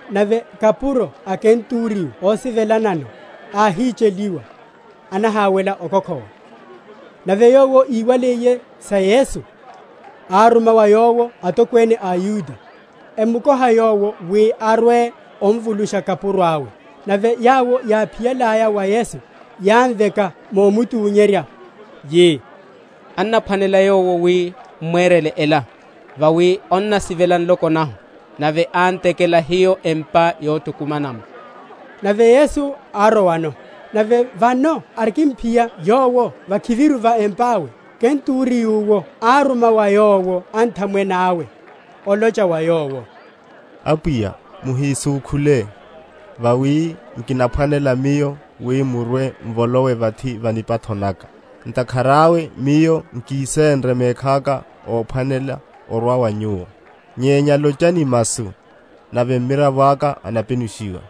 Nave kapuro a Kenturiyo ósivelanano, áhicheliwa, anaháwela okokhowa. Nave yowo íwaliye sa Yesu, áruma wa Yowo atokwene a aYuda, emukoha Yowo wi arwe omvulusha kapuro awe. Nave yawo, yáphiyalaya wa Yesu, yámveka momuthunyerya, yi, Annaphwanela yowo wi m’mwerele ela: vawi annasivela nloko nahu, nave án’tekela hiyo empa yothukumanela’mo. Nave Yesu árowano. Nave vano arikimphiya Yowo vakhiviru va empa awe, kenturiyo’wo áruma wa Yowo anthamwene awe, olocha wa Yowo, Apwiya, muhisúkhule; vawi nkinaphwanela miyo wi murwe‐m’volowe vathi va nipatho naka: ntakhara awe miyo nkisenre mekhaka óphwanela orwa wa Nyuwo; nyenya lochani masu, nave mmiravo aka anapenushiwa.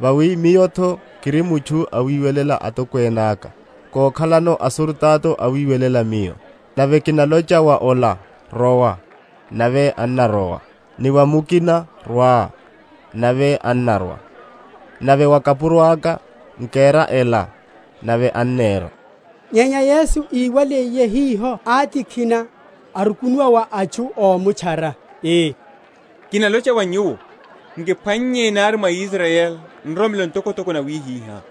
Vawi miyo’tho kiri mutchu awiwelela atokwene aka, kokhalano asurutato awiwelela miyo: nave kinalocha wa ola, Rowa, nave annarowa; ni wa mukina, Rwa, nave annarwa; nave wa kapuro aka, Nkera ela, nave annera. Nyenya Yesu íwaliye hiho átikhina, arukunuwa wa atchu ómutchara, ii, Kinalocha wa nyuwo, nkiphwannye, nari mwa Israyeli, nroromelo ntokotoko nawihiha.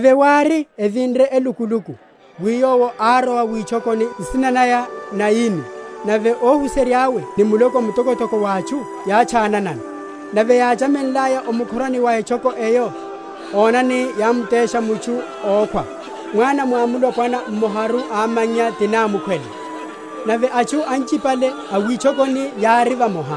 Nave wári, evinre elukuluku, wi Yowo árowa witchokoni, nsina naya Nayini; nave óhuserya’we ni muloko mtokotoko wa atchu yátchananano. Nave yáchamenlaya o mukhorani wa etchoko eyo, onani, yámtesha mutchu ókhwa, mwana mwamulopwana mmoharu, amannya ti námukhwele; nave atchu anchipale a witchokoni yárino vamoha.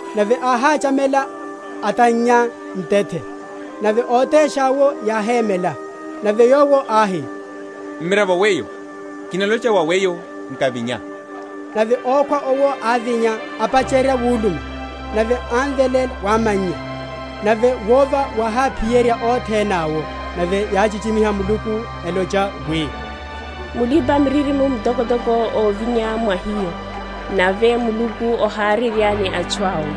Nave áháchamela, atannya ntethe, nave ótesha’wo yáhémela. Nave Yowo áhi, Mmiravo weyo, kinalocha wa weyo, Nkavinya. Nave ókhwa owo ávinya, apacherya wuluma. Nave ámveléla wa amannya. Nave wova wáhaphiyerya othene awo; nave yáchichimiha Muluku, elocha wi, Mulipa‐miririmo mtokotoko ovinya mwa hiyo; nave Muluku oharerya ni atchu awe.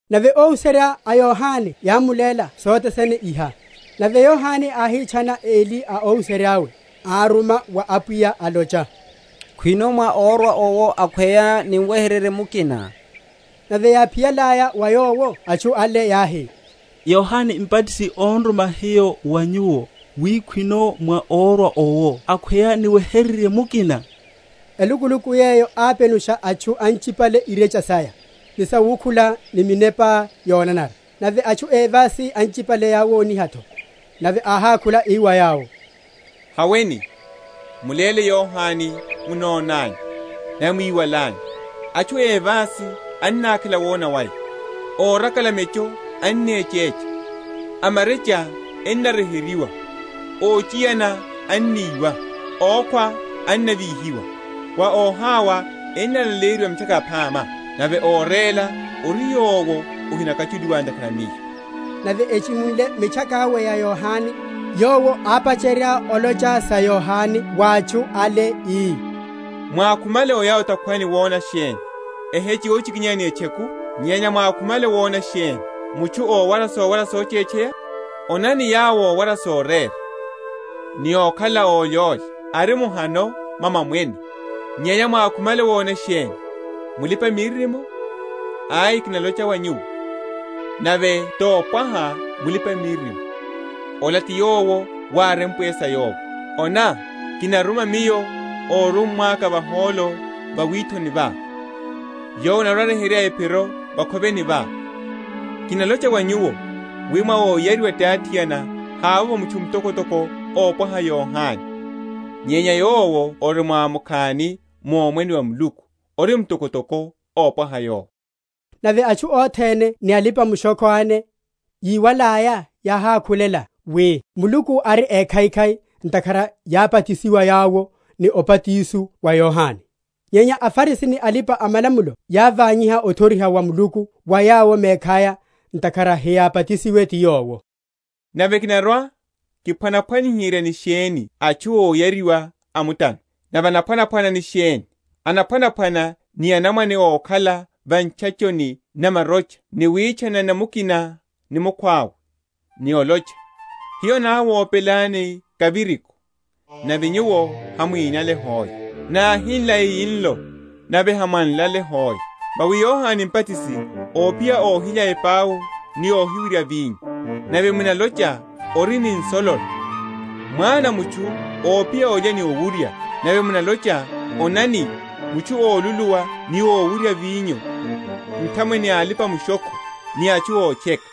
Nave óhuserya a Yohane yámuléla sothe sene iha. Nave Yohane áhitchana eli a óhuserya’we, áruma wa Apwiya, alocha, Khwino mwá órwa owo, akhweya niweheryerye mukina? Nave yáphiyalaya wa Yowo atchu ale, yáhi, Yohane Mbatisi on’ruma hiyo wa nyuwo, wi, Khwino mwá órwa owo, akhweya niweheryerye mukina? Elukuluku yeyo ápenusha atchu anchipale irecha saya, ni sawukhula, ni minepa yonanara; nave atchu évasi anchipale áwoniha’tho. Nave áhákhula, ii wa yawo, Haweni, muléle Yohane monnanyu, nave mwiwalanyu; atchu évasi enakhela wona waya, órakala mecho ennechecha, amarecha ennaryeheryiwa, óchiyana enniwa, ókhwa ennavíhiwa, wa óhawa ennalaleyeryiwa Mitchaka Yaphama. Nave óréla ori yowo ahinakwachuliwa ntakhara a Miyo. Nave echimunle mitchaka awe ya Yohane, Yowo ápacherya olocha sa Yohane wa atchu ale, ii, Mwákhumale oya o’takhwani wona sheni? Eheche yochikinyeya ni etcheku? Nyenya mwákhumale wona sheni? Mutchu ówara sowara sochetcheya? Onani, yawo ówara sorera, ni ókhala ólyólya, ari mu’hano mwa mamwene. Nyenya mwákhumale wona sheni? Mulipa‐miririmo? Ai, kinalocha wa nyuwo, nave topwaha mulipa‐miririmo. Ola ti yowo wárempwe sa yowo, Ona, kinaruma Miyo órummwa’ka vahólo va withoni wá, Yowo anarwa‐aryeherya ephiroá vakhoveni vá. Kinalocha wa nyuwo, wi, Mwa óyariwa ti athiana havovo mutchu mtokotoko ómpwaha Yohane; nyenya yowo ori mwamukhani mu Omwene wa Muluku ori mtokotoko ómpwaha yowo. Nave atchu othene ni alipa‐mushokho ene, yíwalaya, yáhákhulela wi Muluku ari ékhaikhai, ntakhara yábatisiwa yawo ni obatiso wa Yohane. Nyenya aFarisi ni alipa‐malamulo yávanyiha othoriha wa Muluku wa yawo mekhaya, ntakhara hiyábatisiwe ti yowo. Nave, kinarwa‐kiphwaniherya ni sheni atchu óyariwa a mutano? nave enaphwanaphwana ni sheni? Enaphwanaphwana ni anamwane ókhala va ntchachoni na marocha ni witchanana mukina ni mukhwawe, ni olocha, Hiyo náwopelani kaviriko, nave nyuwo hamwínale hoe; náhinla eyinlo, nave hamwánlale hoe. Vawi Yohane Mbatisi ophiya óhilya epau ni óhiwurya vinyo; nave munalocha, Ori ni nsololo. Mwana a mutchu ophiya ólya ni ówurya; nave munalocha, Onani, mutchu óluluwa ni ówuryawurya vinyo, nthamwene a alipa‐mushokho ni atchu ótcheka!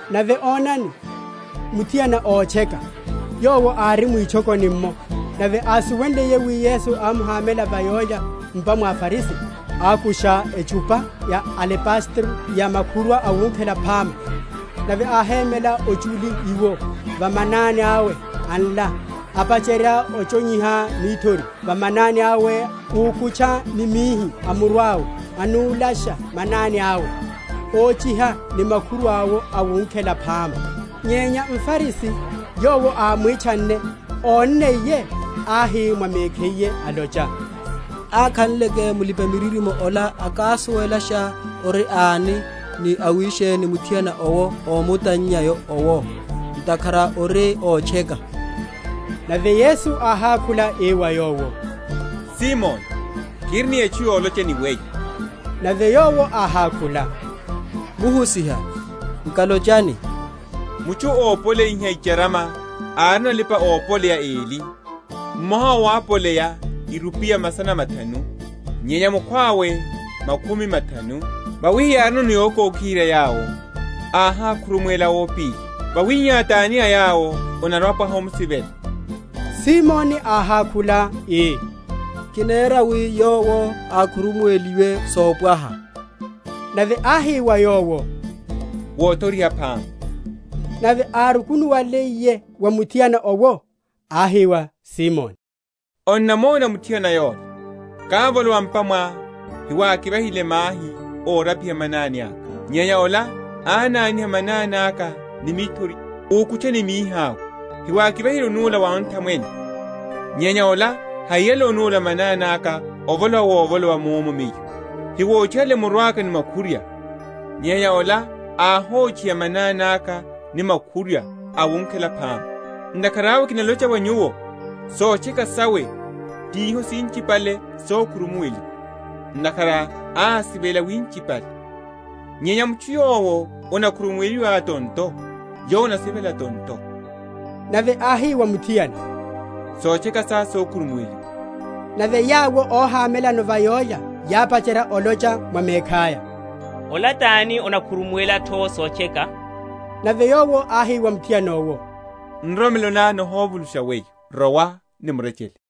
Nave onani, muthiana ótcheka, yowo ári mwitchokoni’mmo; nave ásuwenliye wi Yesu ámuhámela va yólya m’pa mwa mFarisi, ákusha etchupa ya alebastero ya makhurwa awunkhela phama, nave áhémela ochuli iwo, va manani awe, anla, apacherya ochonyeriha mithori va manani awe úkutcha ni mihi a muru awe, anúlasha manani awe, óchiha ni makhurwa’wo awunkhela phama. Nyenya mFarisi, yowo ámwitchanne, ónniye, áhi mwa mekhiye, alocha, Akhanleke mulipa‐miririmo ola akásuwelasha ori ani, ni awisheni muthiana owo ómutannya owo, ntakhara ori ótcheka. Nave Yesu áhákhula ii wa yowo, Simoni, kiri ni etchu yolocha ni weyo. Nave yowo áhákhula, Muhusiha, nkalochani. Mutchu ópoleyiha icharama árino alipa‐opoleya eli: mmoha owo ápoleya irupiya masana mathanu, nyenya mukhwawe makhumi mathanu. Vawi hiyárino yokokiherya yawo, áhákhurumuwela ópili. Wawihihá, tani a yawo anarwa‐apwaha omusivela? Simoni áhákhula, ii, Kinera wi, yowo ákhurumuweliwe sopwaha. Nave áhi wa yowo, Wothoriha phama. Nave árukunuwaliye wa muthiana owo, áhi wa Simoni, Onnamona muthiana yola? Kávolowa m’pa mwá, hewákivahile mahi órapiha manani aka; nyenya ola ánaniha manani aka ni mithori, úkutcha ni mihi awe. Hewákivahile onúla wa onthamwene; nyenya ola hahiyale onúla manani aka, ovolowa wovolowa munno Miyo. Hawóchihale muru aka makhurwa; nyenya ola áhochiha manani aka makhurwa awunkhela phama. Ntakhara awe, kinalocha wa nyuwo, Sotcheka sawe, tiho sinchipale, sokhurumuweliwa; ntakhara ásivela winchipale; nyenya mutchu yowo anamkhurumuweliye tonto, yowo anasivela tonto. Nave áhi wa muthiana, Sotcheka sá sokhurumuweliwa. Nave yawo óhamelano va yólya yápacherya olocha mwa mekhaya, Ola tani anakhurumuwela’tho sotcheka? Nave Yowo áhi wa muthiana owo, Nroromelo ná nihovulusha weyo; rowa ni murechele.